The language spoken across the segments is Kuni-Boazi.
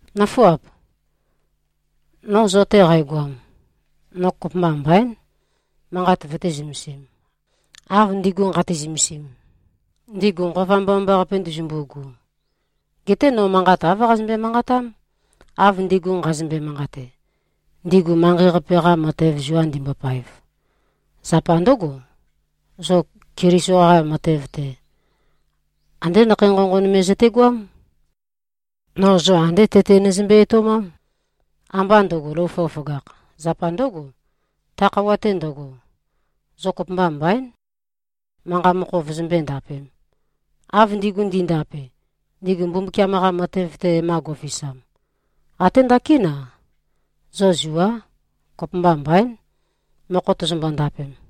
Nǿfuap! No zo-te qægoam, no kopømba mbaín, manqat vøté-zømesīm, av ndigu nqate-zømesim, ndigu Nqova Mbomambaqape ndezømbu꞉gu. Geté no manqat āv qazømbe-manqatám, av ndigu nqazømbe-manqate, ndigu manqei-qape-qa matev zua ndimbopaev. Zapa ndǿgo, zo Keliso-qa matev-te, andé nakhei nqonqon me zøtegoám. No zo andé tete nøzømbe-etoumám, ambá ndø̄go, lou føgøføgākh. Zapa ndǿgo, ta khøuwa-te ndøgo, zo kopømba mbaín, manqa mokho vøzømbøé-ndapēm, av ndigu ndi꞉ndape, ndigu Mbumbukiam-qa matev-te e-ma go꞉fisam. Até ndakín-a, zo zuá, kopømba mbaín, mokho tozombo-ndapem.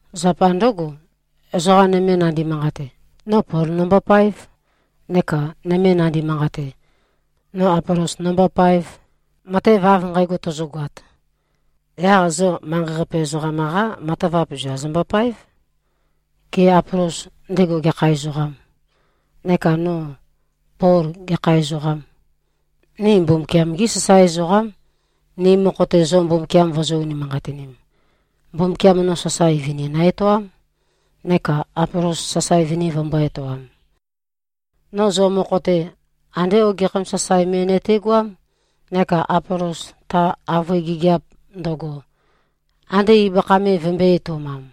Zapa ndǿgo, ezoqa nøme nandi-manqate, “No Pol nombopaēv,” neka nøme nandi-manqate, “No Apolos nombopaēv.” Matev av nqægo tozogoat, yaq zo manqei-qape ezoqam-qá matavap zua zombopáev. Gê, Apolos, ndego gekha ezoqâm? Neka no, Pol, gekha ezoqâm? Ni Mbumbukiam-gí sasae ezoqám, ni mokho-te zo Mbumbukiam vozō-unimanqatinim. Mbumbukiam no sasae vini nø-etoám, neka Apolos sasae vini vømbō-etoam. No zo mokho-te, andé ogekhæm sasae me nøtegoám, neka Apolos, ta avøe gigiap ndøgo, ande ibøkha me vømbø̄e-etoumam.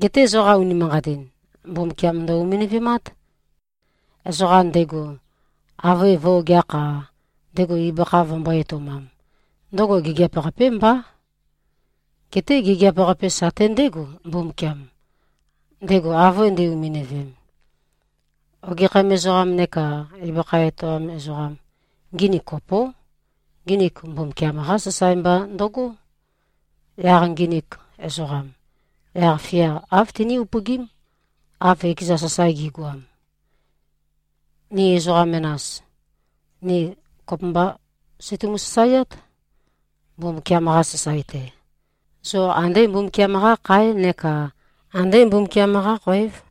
Geté zoqa unimanqatin, Mbumbukiam ndø-uminøvemát. Ezoqa ndego avøe vø̄-ogeakh-a, ndego ibøkha vømbō-etoumam, ndøgo gigiap-qapé mbá. Geté gigiap-qape sate ndégo, Mbumbukiam, ndego avøe nde-uminøvem. Ogekhæm ezoqam neka ibøkha etoam ezoqam, nginik kopó. Nginik Mbumbukiam-qá sasae mba ndøgó. Yaq nginik ezoqam, yaq-fia āv timí-upøgím, av ekeza sasae gi꞉goam. Ni ezoqa menas, ni kopømbá seitumu-sasaeát, Mbumbukiam-qa sasae-te. Zo andé Mbumbukiam-qá kháe neka andé Mbumbukiam-qá khoév.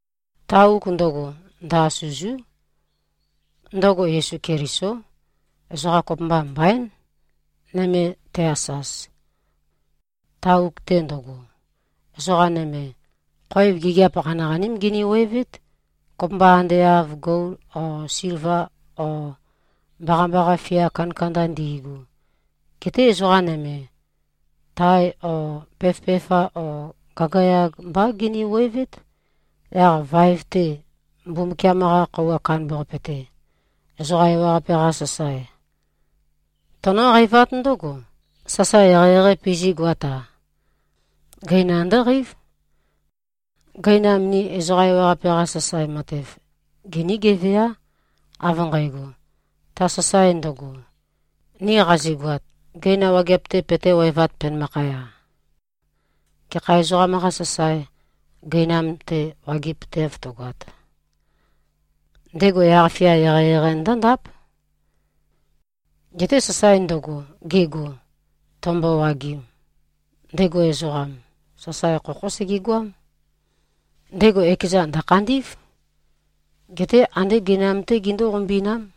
Ta uk ndøgo, ndø-asø̂zú. Ndøgo Yesu Kelisó. Ezoqa kopømba mbaín, nøme te-asaz. Ta uk-te ndøgo, ezoqa nøme, khoev gigiap qaniqaním giniwevét, kopømba ande av gol o silva o mbaqambaqa fia kandakanda ndi꞉gu. Geté ezoqa nøme, tae o peføpefa o gagayag mbá giniwevét. Yaq vaev-te, Mbumbukiam-qa Khøuwa Kandambaqape-te, ezoqa ewaqape-qa sasae, tønǿqeivát ndǿgo, sasae eqeieqeī pizí꞉goat-a. Gøina ndǿqeív. Gøinam ni ezoqa ewaqape-qa sasae matev, giní-geveá, av nqægo, ta sasae ndøgo, ni qazigoat, gøina wageap-te petéwevāt, penømakhaya. Gekha ezoqam-qā sasae, gøinam-te wageapøteav tøgoat, ndego yaq-fia eqeieqei ndǿndáp. Geté sasae ndøgo, gego, tømbowagim, ndego ezoqam, sasae khokhó segegoám. Ndego ekezan, ndø̀khandí꞉v. Geté andé gøinam-té gindú-qombi꞉nám.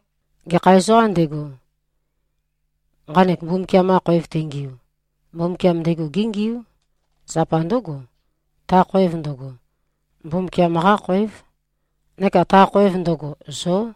Gekha ezoqām ndego, nqanek Mbumbukiam-qa khoev tengiu, Mbumbukiam ndego géngiú. Zapa ndǿgo, ta khoev ndøgo, Mbumbukiam-qá khoév. Neka ta khoev ndøgo, zó.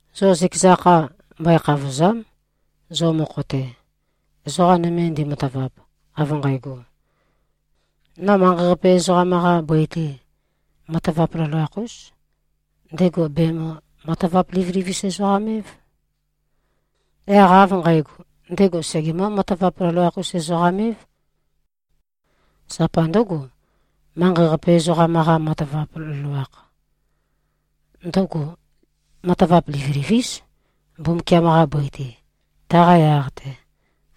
Zo zøkeza kha, mbøe-khavòza᷄m. Zo mokho-te, ezoqa nøme ndematavap, av nqægo, no manqei-qape ezoqam-qa bøi-te, matavap loloakh-ūs, ndego bèmø-matavap-livilivis-us-ezoqam-év. Yaq av nqægo, ndego segemǿ-matavap-loloakh-us-ezoqam-év. Zapa ndǿgo, manqei-qape ezoqam-qa matavap loloakh, ndøgo matavap livilivís, Mbumbukiam-qa bøi-te. Taqa yaq-te,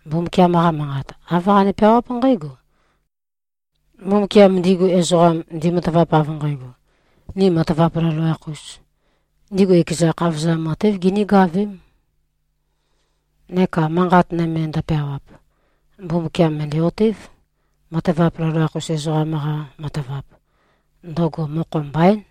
Mbumbukiam-qa Manqat, āv qane-peawáp nqǽgo, “Mbumbukiam ndigu ezoqam, ndimatavap av nqægo, ‘Ni matavap loloakh-ūs,’ ndigu ekeza khavozam matév genégavém.” Neka manqat nøme ndø̄pēāwāp, “Mbumbukiam, mø̀ndæ-otév: Matavap loloakh-us ezoqam-qa matavap, ndøgo mokho mbaín.”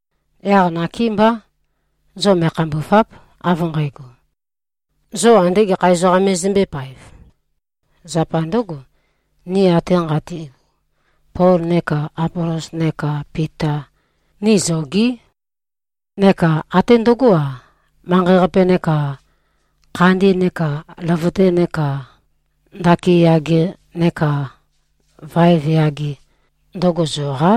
Yaq nakémbá, zo me꞉khambùva᷄p, av nqægo, zo ande gekha ezoqam me zombø̄epaev. Zapa ndǿgo, ni ate nqati꞉gu, Pol neka Apolos neka Pita, ni zogí. Neka até ndøgó-a, manqei-qape neka khandi neka løvøte neka ndaki yage neka vaev yage, ndøgo zoqá.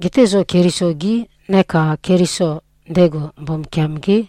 Geté zo Keliso-gí, neka Keliso, ndego Mbumbukiam-gé.